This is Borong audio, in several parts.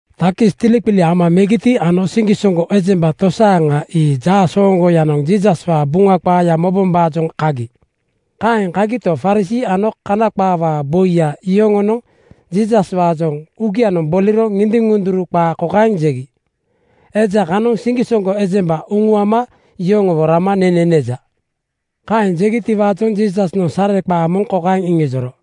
Takis tiliqili ama megiti ano siŋgisoŋgo ejemba tosaaŋa ii jaasooŋgoyanoŋ Jiisaswaa Buŋa qaaya mobombaajoŋ kagi. Kaeŋ kagito, Farisii ano Kana qaawaa boi yoŋonoŋ Jiisaswaajoŋ uugia boliro ŋindiŋ-ŋunduru qaa kokaeŋ jegi, “Eja kanoŋ siŋgisoŋgo ejemba uŋuama yoŋowo rama nene neja.” Kaeŋ jegitiwaajoŋ Jiisasnoŋ sareqaa moŋ kokaeŋ iŋijoro,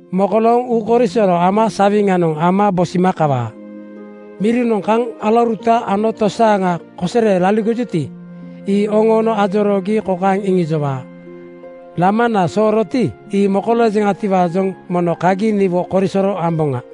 Mokolooŋ uukoisoro ama sawiŋanoŋ ama bosima kawaa. Mirinoŋ kaŋ alauruta ano tosaaŋa kosere laligojuti, ii oŋoono ajoroogi kokaeŋ iŋijowaa, ‘Lamana sooroti, ii mokoloojeŋatiwaajoŋ mono kagi niwo korisoro amboŋa’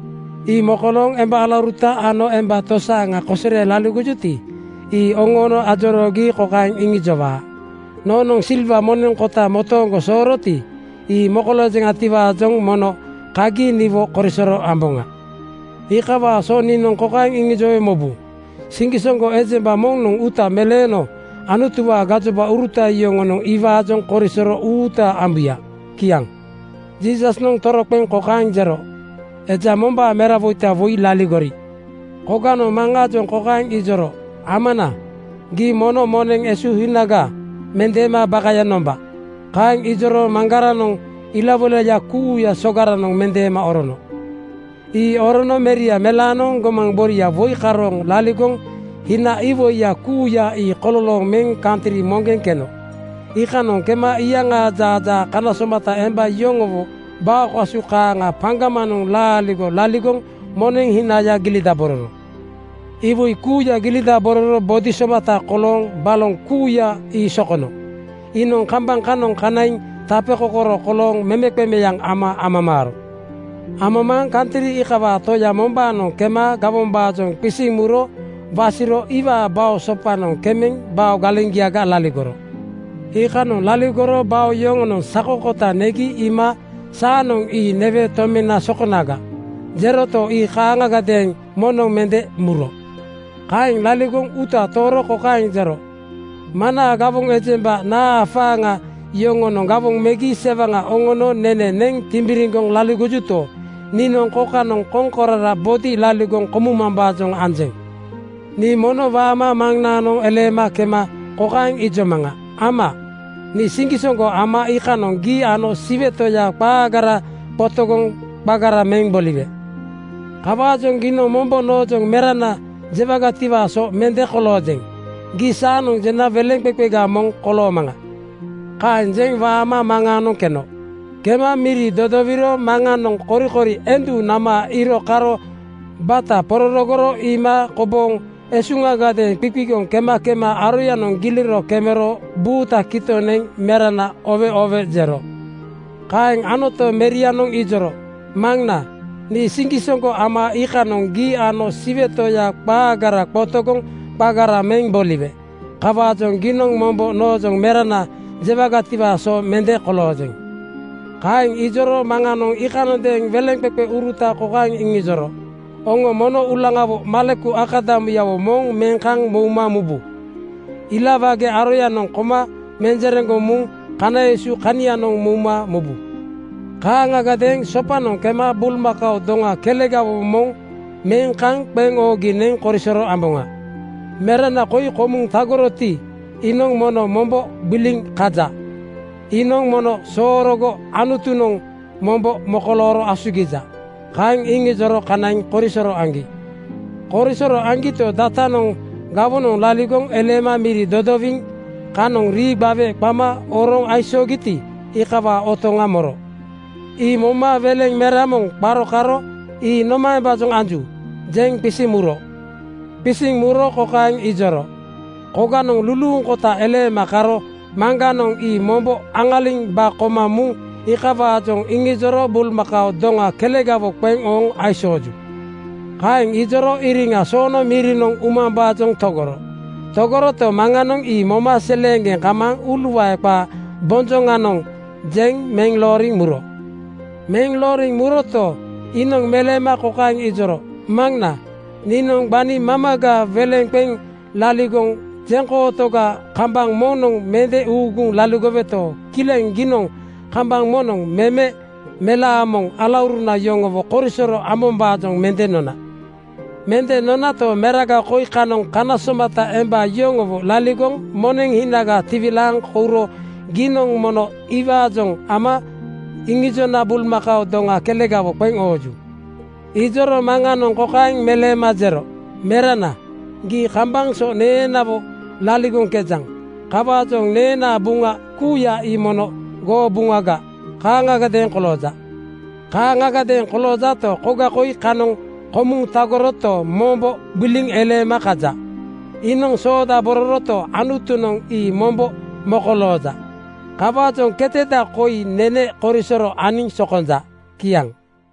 Ii mokolooŋ emba alauruta ano emba tosaaŋa kosere laligojuti, ii oŋoono ajoroogi kokaeŋ iŋijowaa, ‘Noonoŋ silwa moneŋ kota motooŋgonoŋ sooroti, ii mokoloojeŋatiwaajoŋ mono kagi niwo korisoro amboŋa.’ Iikawaa so niinoŋ kokaeŋ iŋijowe mobu: Siŋgisoŋgo ejemba moŋnoŋ uuta meleeno Anutuwaa gajobauruta yoŋonoŋ iwaajoŋ korisoro uuta ambuya.” Kiaŋ. Jiisasnoŋ toroqeŋ kokaeŋ jero, “Eja mombaa merawoita woi laligori. Koganoŋ maŋaajoŋ kokaeŋ ijoro, ‘Amana, gii mono moneŋ esuhinaga mendeema bakaya nomba.’ Kaeŋ ijoro maŋgaranoŋ ilawoilaya kuuya sogaranoŋ mendeema orono. Ii orono meria melaanoŋ gomaŋ boria woi karooŋ laligoŋ hina iwoiya kuuya ii kololooŋ meŋ kantri moŋgeŋ keno. Iikanoŋ kema iyaŋaa jaajaa kana somata emba yoŋowo bao kasu kaaŋa paŋgamaŋ laaligo laligoŋ moneŋ hinaya gilidabororo. “Iwoi kuuya gilidabororo bodi somata kolooŋ baloŋ kuuya ii sokono. Iinoŋ kambaŋ kanoŋ kanaiŋ tapekokoro kolooŋ memeqemeaŋ ama amamaaro. Amamaaŋ kantri iikawaa toya mombaanoŋ kema gawombaajoŋ qisiŋ muro wasiro iwaa bao sopanoŋ kemeŋ bao galeŋgiaga laligoro. Iikanoŋ laligoro bao yoŋonoŋ sako kota negi iima ‘Saanoŋ ii newe tomena sokonaga,’ jeroto, ii kaaŋagadeeŋ moŋnoŋ mende muro. “Kaeŋ laligoŋ uuta tooro kokaeŋ jero, ‘Maŋnaa gawoŋ ejemba naa afaaŋa yoŋonoŋ gawoŋ megi sewaŋa oŋono nene neŋ timbiriŋgoŋ laligojuto, niinoŋ kokanoŋ koŋkorara bodi laligoŋ komumambaajoŋ anjeŋ. Nii mono waama maŋnaanoŋ eleema kema kokaeŋ ijomaŋa, ‘Ama, nii siŋgisoŋgo ama iikanoŋ gii ano Siwe Toya qaagara qotogoŋ qagara meŋ boliwe. Kawaajoŋ giinoŋ mombo noojoŋ ‘Merana,’ jewagatiwaa so mende koloojeŋ. Gii saanoŋ jena weleŋqeqega moŋ koloomaŋa.’ “Kaeŋ jeŋ waama maŋaanoŋ keno. Kema miri dodowiro maŋanoŋ korikori endu nama iiro karo bata pororogoro iima kobooŋ esuŋagadeeŋ qiqigoŋ kema kema aroyanoŋ giliro kemero buuta kitoŋ neŋ ‘Merana, oowe oowe!’ jero. Kaeŋ anoto, merianoŋ ijoro, ‘Maŋna, nii siŋgisoŋgo ama iikanoŋ gii ano Siwe Toya qaagara qotogoŋ qagara meŋ boliwe. Kawaajoŋ giinoŋ mombo noojoŋ ‘Merana,’ jewagatiwaa so mende koloojeŋ.’ “Kaeŋ ijoro maŋanoŋ iikanondeeŋ weleŋqeqeuruta kokaeŋ iŋijoro, ‘Oŋo mono uulaŋawo maleku akadamuyawo moŋ meŋ kaŋ mouma mubu. Ilawage aroyanoŋ koma menjereŋgoŋ muŋ kana esu kanianoŋ mouma mubu. Kaaŋagadeeŋ sopanoŋ kema bulmakao doŋa kelegawo moŋ meŋ kaŋ qeŋ oogi neŋ korisoro amboŋa. Merana koi komuŋ tagoroti, iinoŋ mono mombo gbiliŋ kaja. Iinoŋ mono soorogo Anutunoŋ mombo mokolooro asugija.’ Kaeŋ iŋijoro kanaiŋ korisoro aŋgi. “Korisoro aŋgito, datanoŋ gawonoŋ laligoŋ eleema miri dodowiŋ kanoŋ rii gbawe qama oroŋ aisoogiti, iikawaa otoŋa moro. Ii moma weleŋ mera moŋ qaro karo ‘Ii nomaembaajoŋ anju?’ jeŋ qisiŋ muro. Qisiŋ muro kokaeŋ ijoro, ‘Koganoŋ luluuŋkota eleema karo maŋganoŋ ii mombo aŋaliŋ ba koma muŋ iikawaajoŋ iŋijoro bulmakao doŋa kelegawo qeŋ ooŋ aisooju.’ “Kaeŋ ijoro iriŋa soono mirinoŋ umambaajoŋ togoro. Togoroto, maŋanoŋ ii moma seleeŋgeŋ kamaaŋ uuluae qaa bonjoŋanoŋ jeŋ meŋ looriŋ muro. Meŋ looriŋ muroto, iinoŋ meleema kokaeŋ ijoro, ‘Maŋna, niinoŋ gbani mamaga weleŋga qeŋ laligoŋ jeŋkootoga kambaŋ moŋnoŋ mende uuguŋ laligoweto, kileŋ giinoŋ kambaŋ moŋnoŋ meme (noniŋ) melaa moŋ alauruna yoŋowo korisoro ambombaajoŋ mende nona. Mende nonato, meraga koi kanoŋ kana somata emba yoŋowo laligoŋ moneŋ hinaga tiwilaaŋ kouro giinoŋ mono iwaajoŋ ama iŋijona bulmakao doŋa kelegawo qeŋ ooju.’ “Ijoro maŋanoŋ kokaeŋ meleema jero, ‘Merana, gii kambaŋ so neenawo laligoŋkejaŋ. Kawaajoŋ neenaa buŋana kuuya ii mono goo buŋaga kaaŋgadeeŋ kolooja. Kaaŋgadeeŋ koloojato, koga koi kanoŋ komuŋ tagoroto, mombo gbiliŋ eleema kaja. Iinoŋ soodabororoto, Anutunoŋ ii mombo mokolooja. Kawaajoŋ keteda koi nene korisoro aniŋ sokonja.’” Kiaŋ.